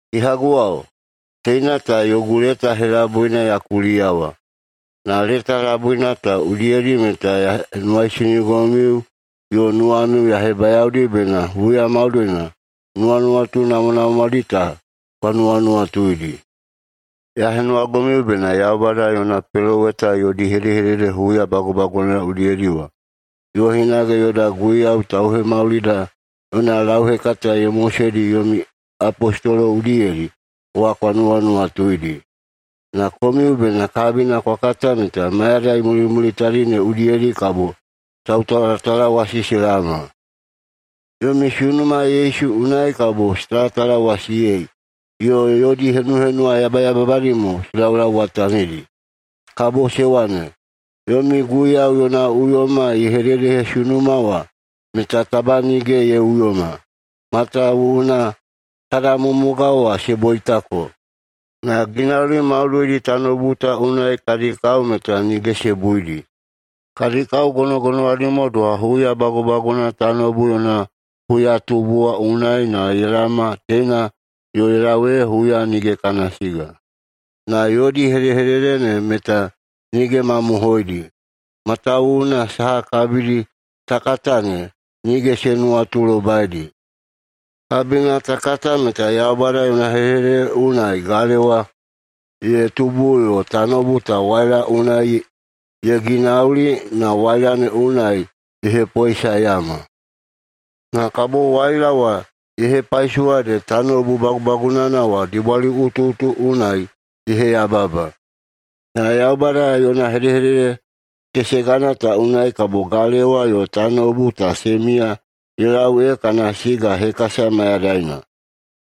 Kehaguwao, teina ta yogu leta helabuina ya kuliyawa. Na leta labui ta udiyedi meta ya henuwaisinigomiu yo nuwamiu ya hebayaodi bena huya maudoina nuwanuwatu namwanamwadi ta kwa nuwanuwatuidi. Ya henuwagomiu bena Yaubada yona peloweta yodi hedehedede huya bagubagunana udiyedi wa, yo hinage yoda Guiyau Tauhemaulida yona lauhekata ye moseidi yomi apostolo udiyedi wa kwa nuwanuwatuidi. Na komiu bena kabina kwa kata meta mayadai mulimulitadi ne udiyedi kabo tautalatalawasi se laoma. Yomi sunuma Yesu unai kabo se talatalawasiyei yo yodi henuhenuwa yabayababadi mo se laulauwatanidi. Kabo se wane, “Yomi Guiyau yona uyoma ye hededehesunuma wa meta taba nige ye uyoma. Matawuwuna kada mumugao wa se boitako, na ginauli maudoidi tanoubu ta unai kadi kao meta nige se buidi. Kadi kao gonogonowadi mo doha huya bagubagunana tanoubu yona huyatubu wa unai na ye laoma teina yo ye lau ee huya nige kana siga.” Na yodi hedehedede ne meta nige mamohoidi, matawuwuna saha kabidi ta kata ne nige se nuwatulobaidi. Kabina ta kata meta Yaubada yona hedehedede unai galewa ye tubu yo tanoubu ta waila unai ye ginauli na waila ne unai ye hepoesaeyama. Na kabo waila wa ye hepaisowa ede tanoubu bagubagunana wa dibwaliꞌutuꞌutu unai ye heyababa. Na Yaubada yona hedehedede kesegana ta unai kabo galewa yo tanoubu ta se miya ye lau ee kana siga hekasa mayadaina.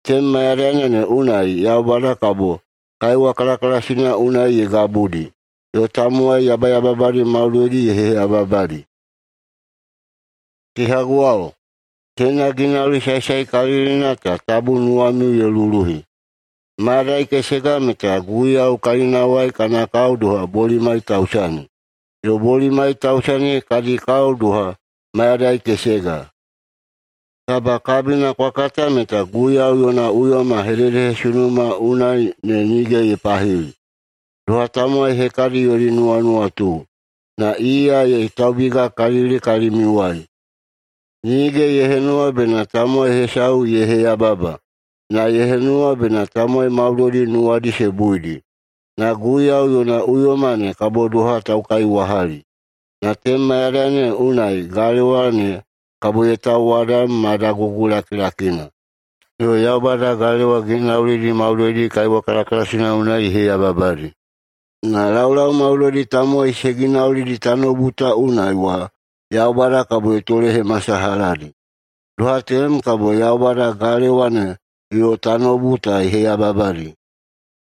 Tenem mayadaina ne unai Yaubada kabo kaiwa kalakalasina unai ye gabudi, yo tamowai yabayababadi maudoidi ye heyababadi. Kehaguwao, teina ginauli saesaekalilina ta tabu nuwamiu ye luluhi: Mayadai kesega meta Guiyau kalinawai kana kao doha bolimai tausani, yo bolimai tausani kadi kao doha mayadai kesega. Taba kabina kwa kata meta Guiyau yona uyoma hededehesunumana unai ne nige ye pahili, doha tamowai hekadi yodi nuwanuwatu. Na iya ye taubigakalili kalimiuwai, nige ye henuwa bena tamowai hesau ye heyababa, na ye henuwa bena tamowai maudoidi nuwadi se buidi. Na Guiyau yona uyoma ne kabo doha taukaiwahali. Na tenem mayadaina ne unai galewa ne kabo ye tauwadam ma dagugu lakilakina, yo Yaubada galewa ginaulidi maudoidi kaiwa kalakalasina unai ye heyababadi. Na laulau maudoidi tamowai se ginaulidi tanoubu ta unai wa Yaubada kabo ye tolehemasalahadi. Doha tenem kabo Yaubada galewa ne yo tanoubu ta ye heyababadi,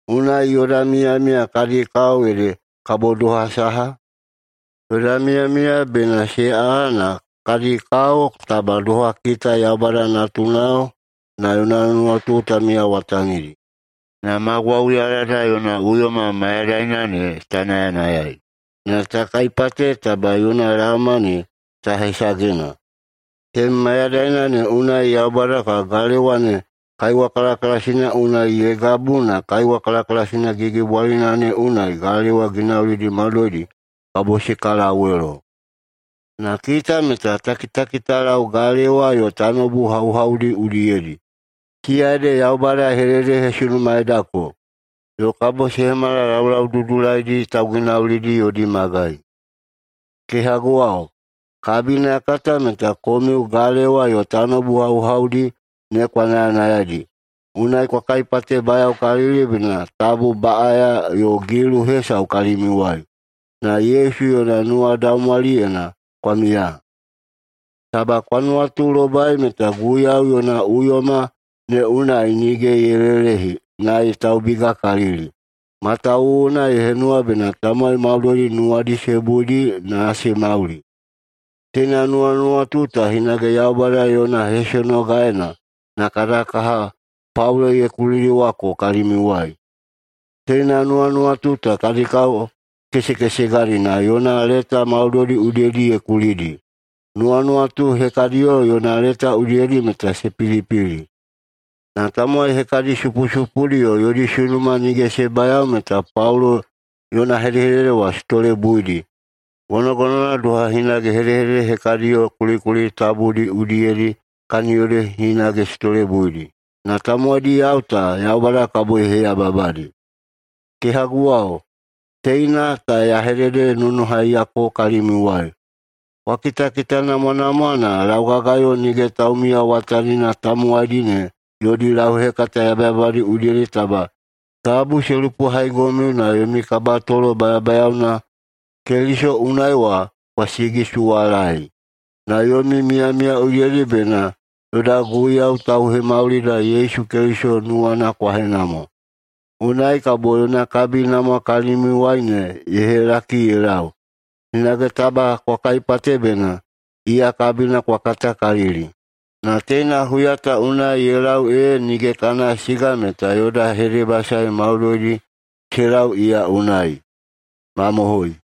unai yoda miyamiya kadi kao ede kabo doha saha? Yoda miyamiya bena se aꞌa na kadi kao taba doha kita Yaubada natunao na yona nuwatu ta miyawatanidi, na ma gwauyalada yona uyoma mayadaina ne ta nayanayai, na ta kaipate taba yona laoma ne ta hesagena. Tenem mayadaina ne unai Yaubada kabo galewa ne kaiwa kalakalasina unai ye gabu na kaiwa kalakalasina gigibwalina ne unai galewa ginaulidi maudoidi kabo se kalawelo. Na kita meta ta kitakitalau galewa yo tanoubu hauhaudi udiyedi. Siya ede Yaubada ye hededehesunumaeidako, yo kabo se hemala laulau dudulaidi tauginaulidi yodi magai. Kehaguwao, kabina ya kata meta komiu galewa yo tanoubu hauhaudi ne kwa nayanayaidi, unai kwa kaipatebayaokalili bena tabu baꞌaya yo gilu hesau kalimiuwai, na Yesu yona nuwadaumwaliyena kwa miya. Taba kwa nuwatulobai meta Guiyau yona uyoma ne unai nige ye lelehi na ye taubigakalili, matawuwuna ye henuwa bena tamowai maudoidi nuwadi se buidi na se mauli. Teina nuwanuwatu ta hinage Yaubada yona hesonogaena na kada kaha Paulo ye kulidiwako kalimiuwai. Teina nuwanuwatu ta kadi kao kesekesegadi na yona leta maudoidi udiyedi ye kulidi. Nuwanuwatudi hekadiyo yona leta udiyedi meta se pilipili, na tamowai hekadi supusupudi yo yodi sunuma nige se bayao meta Paulo yona hedehedede wa se tolebuidi, gonogonowana doha hinage hedehedede hekadiyo kulikuli tabudi udiyedi kaniyodi hinage se tolebuidi. Na tamowaidiyao ta Yaubada kabo ye heyababadi. Kehaguwao, teina ta ya hededenonohaiyako kalimiuwai: Kwa kitakitanamwanamwa na laugagayo nige taumiyawatanina tamowaidi ne yodi lauhekata yabayababadi udiyedi taba tabu se lupohaigomiu na yomi kabatolo bayabayaona Keliso unai wa kwa sigisuwalaei. Na yomi miyamiya udiyedi meta bena yoda Guiyau Tauhemaulida Yesu Keliso nuwana kwa henamwa. Unai kabo yona kabinamwa kalimiuwai ne ye helaki ye lau. Hinage taba kwa kaipate bena iya kabina kwa katakalili. Na teina huya ta unai ye lau ee nige kana siga meta yoda hedebasae maudoidi se lau iya unai. Mamohoi.